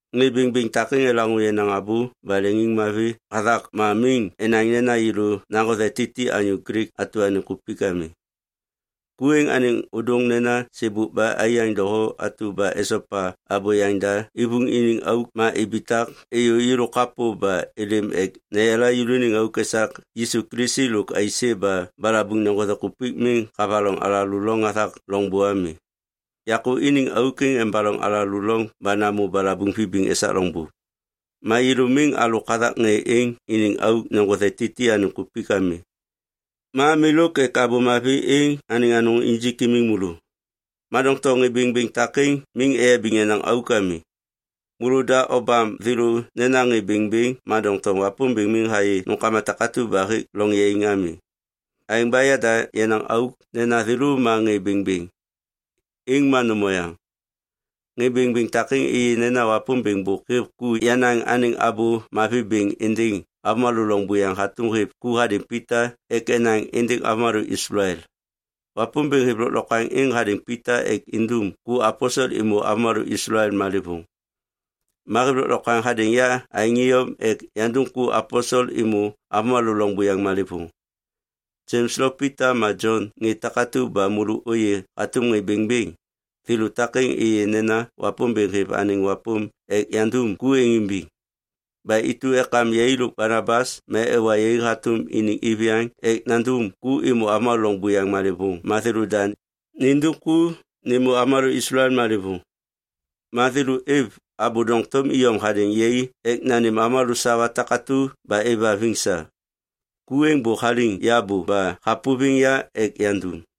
Ŋê bêŋbêŋ takêŋ elaŋô yenaŋ abô ba leŋiŋmavi hathak ma miŋ enaŋ nena yêlô naŋgothe Titi anyô Glik atu anêŋ kupik ami. Ku êŋ anêŋ ôdôŋ nena sêbôk ba aiyaŋ doho atu ba esopa abô yaŋda ivuŋ iniŋ auk ma ibitak êyô yêlô kapô ba êlêm ek neyala yêlôaniŋ auk esak Yisu Kilisi lôk aisê ba balabuŋ neŋgothe kupik miŋ havaloŋ alalô loŋ hathak loŋbô ami. Yakô iniŋ auk êŋ embaloŋ alalô loŋ ba namô balabuŋ vibiŋ esak loŋbô. Ma yêlô miŋ alôk hathak ŋê êŋ iniŋ auk neŋgothe Titi anêŋ kupik ami, ma milôk ek Abô Mavi êŋ anêŋ anôŋ injik imiŋ môlô. Ma doŋtom ŋê bêŋbêŋ takêŋ miŋ eyabiŋ yenaŋ auk ami. Môlôda obam thêlô nena ŋê bêŋbêŋ ma doŋtom Wapômbêŋ miŋ hayê nômkama takatu ba hêk loŋ yaiŋ ami. Aêŋ ba yada yenaŋ auk nena thêlô ma ŋê bêŋbêŋ, êŋ ma nôm oyaŋ. Ŋê bêŋbêŋ takêŋ êyê nena Wapômbêŋ bôk hêv ku yanaŋ anêŋ Abô Mavi bêŋ êndêŋ avômalô loŋ buyaŋ hatôm hêv ku hadêŋ Pita ek enaŋ êndêŋ avômalô Islael. Wapômbêŋ hêv lôklokwaŋ êŋ hadêŋ Pita ek indum ku aposel êmô avômalô Islael malêvôŋ. Ma hêv lôklokwaŋ hadêŋ ya aêŋ iyom ek yandum ku aposel êmô avômalô loŋ buyaŋ malêvôŋ. Jems lo Pita ma Jon ŋê takatu ba môlô ôyê hatôm ŋê bêŋbêŋ, thêlô takêŋ êyê nena Wapômbêŋ hêv anêŋ wapôm ek yandum ku êŋ imbiŋ. Ba intu ekam yai lôk Banabas ma ewa yai hatôm iniŋ iviyaŋ ek nandum ku êmô avômalô loŋ buyaŋ malêvôŋ ma thêlôda nindum ku nêmô avômalô Islael malêvôŋ. Ma thêlô êv abô doŋtom iyom hadêŋ yai ek nanêm avômalô sawa takatu ba êvhaviŋ sa. Ku êŋ bôk haliŋ ya bô ba hapôviŋ ya ek yandum.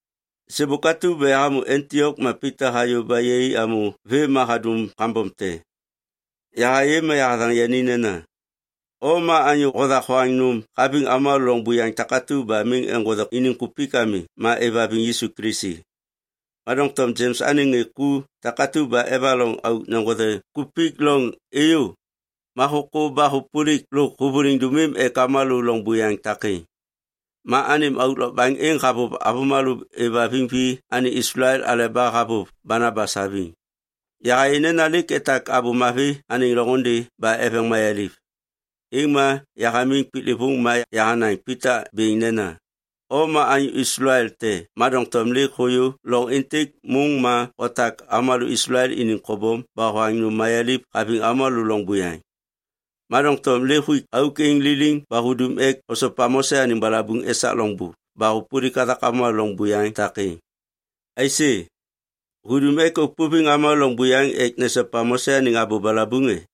Sêbôk atu ba yahamô Antiok ma Pita hayô ba yai amô vêm ma hadum kambom te. Yahayê ma yahathaŋ yani nena, “O ma anyô hothak hoaŋ nôm haviŋ avômalô loŋ buyaŋ takatu ba miŋ eŋgothe iniŋ kupik ami ma êvhaviŋ Yisu Kilisi. Ma doŋtom Jems anêŋ ŋê ku takatu ba evaloŋ auk neŋgothe kupik loŋ êyô, ma hôkô ba hôpôlik lôk hôvôliŋ dômim ek avômalô loŋ buyaŋ takêŋ. Ma anêm auk lôkbaŋ êŋ havôv avômalô êvhaviŋ vi anêŋ Islael aleba havôv Banabas haviŋ.” Yahayê nena lêk etak Abô Mavi anêŋ loŋôndê ba eveŋ mayaliv, êŋ ma yahamiŋ piklêvôŋ ma yahanaŋ Pita bêŋ nena, “O ma anyô Islael te ma doŋtom lêk hôyô loŋ êntêk môŋ ma hotak avômalô Islael iniŋ kobom ba hoaŋ nôm mayaliv haviŋ avômalô loŋ buyaŋ. Ma doŋtom lêk huik auk êŋ liliŋ ba hudum ek osopa Mose anêŋ balabuŋ esak loŋbô ba hôpôlik hathak avômalô loŋ buyaŋ takêŋ. Aisê, hudum ek ôpôviŋ avômalô loŋ buyaŋ ek nesopa Mose anêŋ abô balabuŋ e?”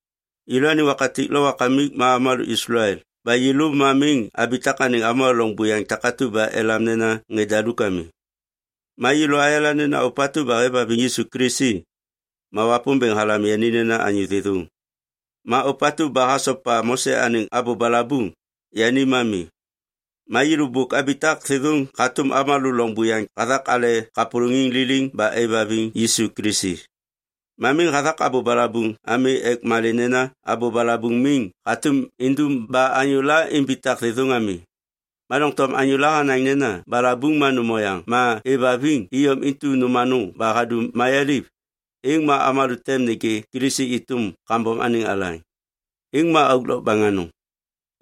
Yêlôaniŋ wakatik lo wakamik ma avômalô Islael ba yêlô ma miŋ abitak anêŋ avômalô loŋ buyaŋ takatu ba elam nena ŋê daluk ami. Ma yêlô ayala nena ôpatu ba hêvhaviŋ Yisu Kilisi, ma Wapômbêŋ halam yani nena anyô thêthôŋ. Ma ôpatu ba hasopa Mose anêŋ abô balabuŋ, yani ma mi. Ma yêlô bôk abitak thêthôŋ hatôm avômalô loŋ buyaŋ hathak ale kapôlôŋiŋ liliŋ ba aêvhaviŋ Yisu Kilisi. Ma miŋ hathak abô balabuŋ ami ek malê nena abô balabuŋ miŋ hatôm indum ba anyôla imbitak thêthôŋ ami. Ma doŋtom anyôla hanaŋ nena balabuŋ ma nôm oyaŋ ma êvhaviŋ iyom intu nôm anôŋ ba hadum mayaliv, êŋ ma avômalô tem nêgê Kilisi êtôm kambom anêŋ alaŋ. Êŋ ma auk lokbaŋ anôŋ!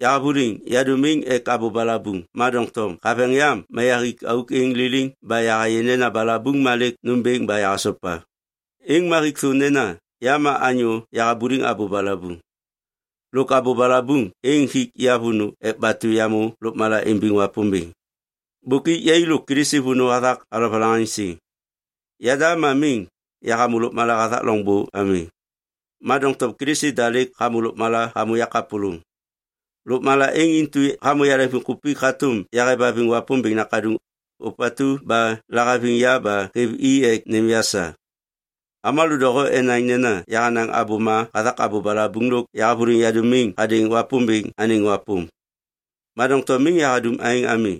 Yahavôliŋ yadômiŋ ek abô balabuŋ ma doŋtom haveŋ yam ma yahik auk êŋ liliŋ ba yahayê nena balabuŋ ma lêk nômbêŋ ba yahasopa. Êŋ ma hik thô nena ya ma anyô yahabuliŋ abô balabuŋ. Lôk abô balabuŋ êŋ hik ya vônô ek batu yamô lôkmala imbiŋ Wapômbêŋ. Bôk ik yai lôk Kilisi vônô hathak alovalaŋaŋsiŋ. Yada ma miŋ yahamô lôkmala hathak loŋbô ami. Ma doŋtom Kilisi da lêk hamô lôkmala hamô yakapôlôŋ. Lôkmala êŋ intu hamô yaleŋviŋkupik hatôm yahêvhaviŋ Wapômbêŋ Nakaduŋ, ôpatu ba lahaviŋ ya ba hêv i ek nêm ya sa. Avômalô doho enaŋ nena yahanaŋ abôma hathak abô balabuŋ lôk yahavôliŋ yadômiŋ hadêŋ Wapômbêŋ anêŋ wapôm. Ma doŋtom miŋ yahadum aêŋ ami.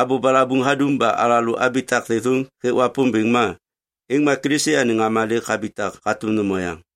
Abô balabuŋ hadum ba alalô abitak thêthôŋ hêk Wapômbêŋ ma, êŋ ma Kilisi anêŋ ŋama lêk habitak hatôm nôm oyaŋ.